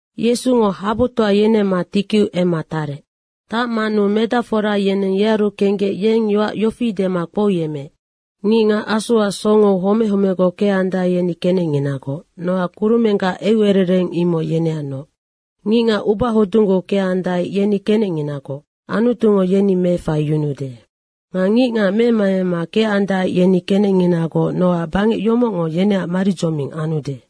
Yesungo habutoa yenemma tikiu emma tarec. Tacmanu medacfora yeneng yearu kenggec yeng yoac yofi dema kpouyemmeec. “Ngicngac Asuac songou home homegoc kecandae, yeni kenecnginagoc, nocac kurumenggac eucerereng imoc yeneacnoc. Ngicngac ubahodunggoc kecandae, yeni kenecnginagoc, Anutungo yeninoc meefaiyunuude. Nga ngicngac memaemema kecandae, yeni kenecnginagoc, nocac bangec yomocngo yeneac maridzoming anude.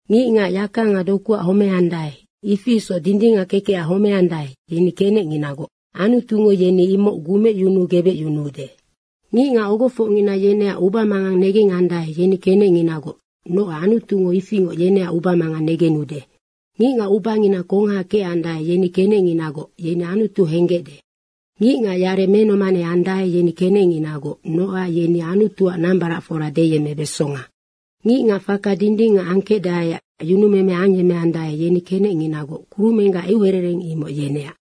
Ngicngac yaka nga dokuac homeandae, ifi isoc dindingac kekecac homeandae, yeni kenecnginagoc, Anutungo yeni imoc gumecyunuu gebecyunuude. Ngicngac ogofocngina yeneac ubamangang negengandae, yeni kenecnginagoc, nocac Anutungo ifingoc yeneac ubamangang negenude. Ngicngac ubangina kongaha kecandae, yeni kenecnginagoc, yeni Anutu henggecde. Ngicngac yare menomaneandae, yeni kenecnginagoc, nocac yeni Anutuac nambaracfora deyemmebesonga. Ngicngac faka dindingac angkecdaeac yunumeme ayemmeandae, yeni kenecnginagoc, kurumenggac eucerereng imoc yeneac.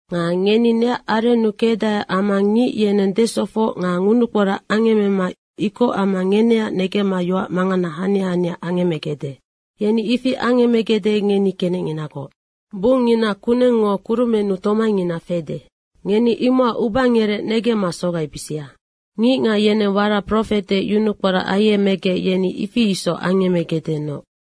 Nga ngeni neac arennu kecdaeac amma ngic yeneng desofoc nga ngunukporac angemmema ikoc amma ngeneac negemma yoac mangana hania hania angemmegecde. Yeni ifi angemmegecde, ngeni kenecnginagoc. Bungngina kunengngo kurumennu tomaingina fede. Ngeni imocac ubangerec negemma sogaibisia. Ngicngac yeneng warac profete yunukporac ayemmegec, yeni ifi isoc angemmegecdenoc.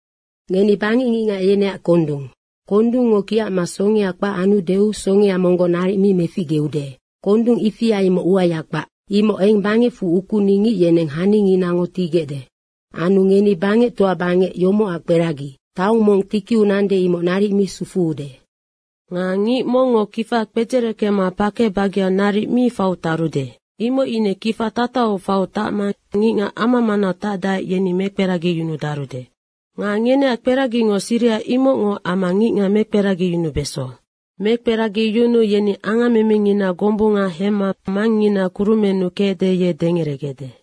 Ngeni bangecngicngac yeneac kondung. Kondungngo kiacma songea kpac anudeu songea monggoc naric mi meficgeude. Kondung ifia, imoc uaya kpac. Imoc eng bangecfu ukuni ngic yeneng haningo tigecde. Anu ngeni bangectoa bangec yomocac kperagi. Taong mong tikiu nande, imoc naric mi sufuude. Nga ngic mongngo kifa kpedzereckema pake bageau naric mi faiu tarude. Imoc ine kifa tatahau faiu tacma ngicngac ama manau tacdae, yeni mekperagiyunudarude. Nga ngeneac kperagingo siriha imocngoc amma ngicngac mekperagiyunubeso. Mekperagiyunuu yeni angammemengina gombunga hemma Mangngina kurumennu kecde, ye dengeregecde.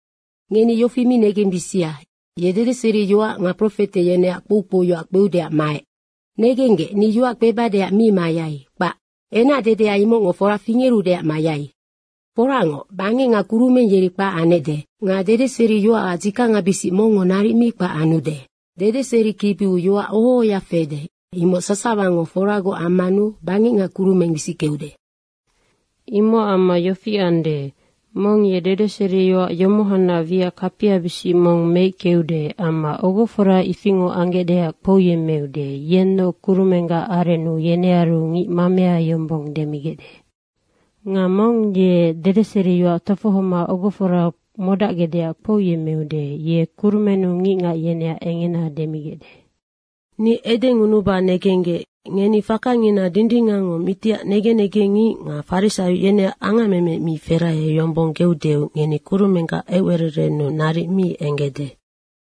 Ngeni yofi mi negembisia, ye dedeseriyoac nga profete yeneac kpoukpouyoac kpeudeac maec. Negenggec, ni yoac kpebadeac mi mayai, kpac. Enacdedea imocngo fora fingerudeac mayai. Foracngoc, bangec nga kurumeng yeri kpac anecde. Nga dedeseriyoacac dzikangabisic mongngo naric mi kpac anude. Dedeseri kibiu yoac oho ohoya fede, imoc sasawango foragoc ammanu bangec nga kurumeng wisickeude. Imocac amma yofi ande, mong ye dedeseriyoac yomohacnac wiac kapiabisic mong meickeude amma ogofora ifingoc anggecdeac kpouyemmeude, yennoc kurumenggac areng yenearunac ngic mamea yombong demigecde. Nga ngic mong ye dedeseriyoac tofohoma ogofora modacgecdeac kpouyemmeude, ye kurumennu ngicngac yeneac engena demigecde. Ni edengunuba negenggec, ngeni fakangina dindingacngo mitiac negen negengngic nga farisaio yeneac angammeme mi feraheyombonggeudeu ngeni kurumenggac eucererennu naric mi enggecde.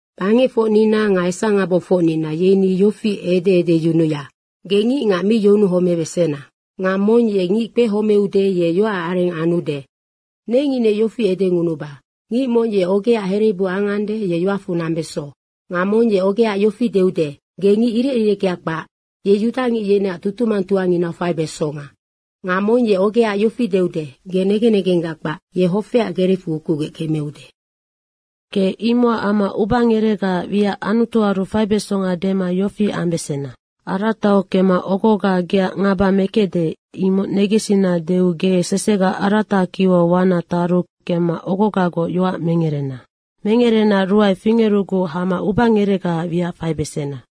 Bangecfocnina nga esangabofocnina yeni yofinoc ede edeyunuya, ‘Ge ngicngac mi yunuhomebesena. Nga mong ye ngic kpehomeude, ye yoacac areng anude.’ Neng ine yofi edengunuba, ngic mong ye ogeaac herebu angande, ye yoacfu nambeso. Nga mong ye ogeaac yofi deude, ‘Ge ngic irec ireckea kpac.’ Ye yudangic yeneac tutumangtoanginau faibesonga. Nga mong ye ogeaac yofi deude, ‘Ge negen negengga kpac.’ ye hofeac gerecfu ukugec kemeude. Ge imocac amma ubangerecgaac wiac Anutuaru faibeso dema yofi ambesena. Aratau kemma ogoga geac ngaba mekecde, imoc negensinadeu ge sesega arata kiwau wana taru kemma ogogagoc yoac mengerena. Mengerena ruae fingeruguc hama ubangerecgaac wiac faibesena.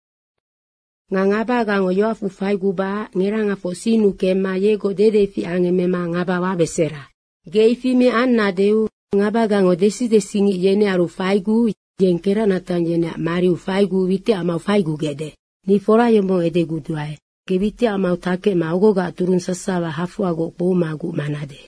Nga ngabagango yoacfu faigubacac ngerahafoc sinnu kemma yegoc dedefic angemema ngaba wabesera. Ge ifi mi annadeu ngabagango desi desingic yearu faiguu yeng keracnatang yeneac mariu faiguu witicamau faigugecde. Ni fora yombong edeguduae, ge witicamau takecma ogogaac turung sasawa hafoangoc kpoumaguc manade.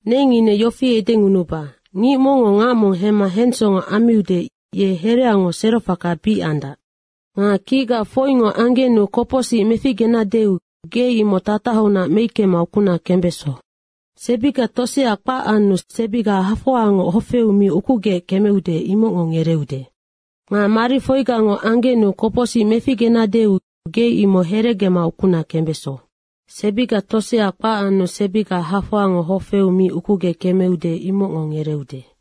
Neng ine yofi edengunuba, ngic mongngo ngac mong hemma hensongo ammiude, ye hereango serofaka bic andac. Nga kicga foingo anggenu kopocsic meficgenadeu ge imoc tatahaunac meickema ukuna kembeso. Sebiga tosea kpac anu sebiga hafoangoc hofeu mi ukugecde, imocngo ngereeude. Nga marifoigango anggenu kopocsic meficgenadeu ge imoc herecgema ukuna kembeso. Sebiga tosea kpac anu sebiga hafoangoc hofeu mi ukugec kemeude, imocngo ngereeude.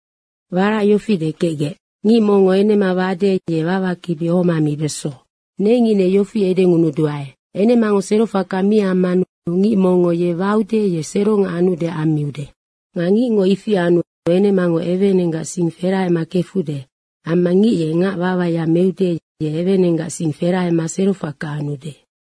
Warac yofi dekecgec, ‘Ngic mongngo enema wade, ye wawakibi ohoma mibeso.’ Neng ine yofi edengunuduae, enemango serofaka mi ammanu ngic mongngo ye waude, ye serongac anudeac ammiude. Nga ngicngo ifi anu enemango eweenenggac sing ferahema kefude. Amma ngic ye ngac wawaya meude, ye eweenenggac sing ferahema serofaka anude.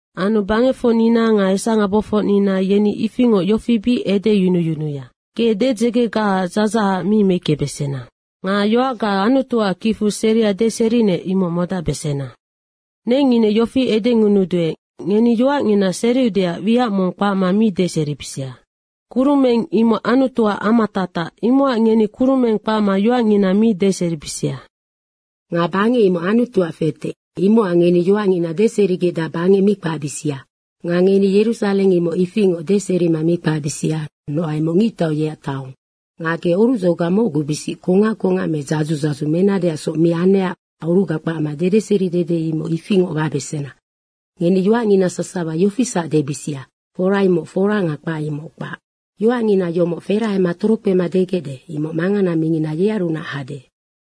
Anu bangecfocnina nga esangabofocnina yeni ifingoc yofi bic edeyunuyunuya, ‘Ge dedzegegaac dzadzahac mi meickebesena. Nga yoacga Anutuac kicfu seria deserinec, imoc modacbesena.’ Neng ine yofi edengunuduae, ngeni yoacngina seriudeac wiac mong kpacma mi deseribisia. Kurumeng imoc Anutuac amatatac, imocac ngeni kurumeng kpacma yoacngina mi deseribisia. Nga bangec, imoc Anutuac fetec, imocac ngeni yoacngina deserigecdeac bangec mi kpacbisia. Nga ngeni Yerusareng imoc ifingoc deserima mi kpacbisia nocac imoc Ngictautoa, yeac taong. Nga ge orucdzoga mocgubisic kongac kongac me dzadzu dzadzu menadeacsoc mi annecac orucga kpacma dedeseri dede, imoc ifingoc wabesena. Ngeni yoacngina sasawa yofisac debisia, ‘Fora imoc fora nga kpac imoc kpac. Yoacngina yomoc ferahema torokpema degecde, imoc mangana mingina yearunac hade.’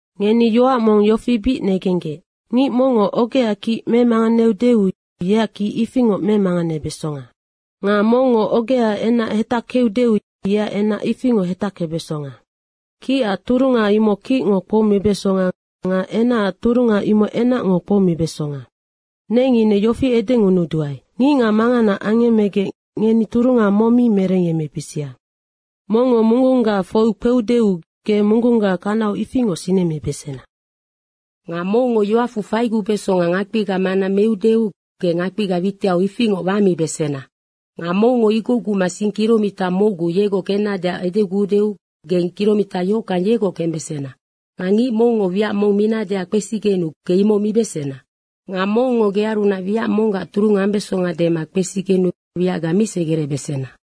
Ngeni yoac mong yofi bic negenggec, ‘Ngic mongngo ogeaac kic memanganeudeu yeac kic ifingoc memanganebesonga. Nga mongngo ogeaac enac hetackeudeu yeac enac ifingoc hetackebesonga. Kicac turunga imoc kicngo kpoumibesonga nga enacac turunga imoc enacngo kpoumibesonga.’ Neng ine yofi edengunuduae, ngicngac mangana angemmegec ngeni turunga mong mi merengyemmebisia. Mongngo munggungga foiu kpeudeu geng munggungga kanau ifingoc sinemibesena. Nga mongngo yoacfu faigubesonga ngakpiga mana meudeu ge ngakpiga witiau ifingoc wamibesena. Nga mongngo igocguma sing kiromita mocgu yegoc kennadeac edeguudeu geng kiromita yohockang yegoc kembesena. Nga ngic mongngo wiac mong minadeac kpesigenu ge imoc mibesena. Nga mongngo gearunac wiac monggac turung ambesonga dema kpesigenu wiacga mi segerebesena.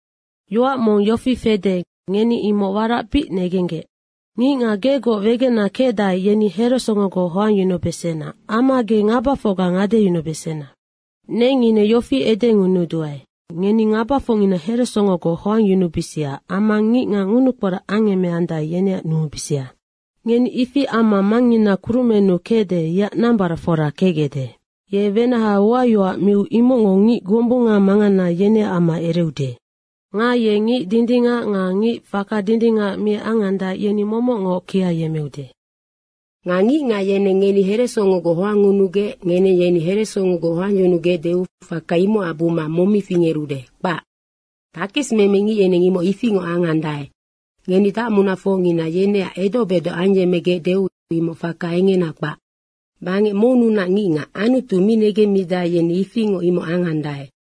Yoac mong yofi fede, ngeni imoc warac bic negenggec, ‘Ngicngac gegoc wegena kecdae, yeni heresongogoc hoangyunubesena amma ge ngabafocga ngadeyunubesena.’ Neng ine yofi edengunuduae, ngeni ngabafocngina heresongogoc hoangyunubisia amma ngicngac ngunukporac angemmeandae, yeneac numubisia. Ngeni ifi amma Mangngina kurumennu kecde, yeac nambaracfora kecgecde. Ye wenaha uayoac miu imocngo ngic gombunga mangana yeneac amma ereude. Nga ye ngic dindingac nga ngic faka dindingac mi angandae, yeni momocngoc kia yemmeude. Nga ngicngac yeneng ngeni heresongogoc hoangngunugec ngeneng yeni heresongogoc hoangyunugecdeu faka imocac buma mong mi fingerude, kpac. Takesimeme ngic yeneng imoc ifingoc angandae. Ngeni dacmunafocngina yeneac edoc bedoc ayemmegecdeu imoc faka engena kpac. Bangec monnunac ngicngac Anutu mi negemmidae, yeni ifingoc imoc angandae.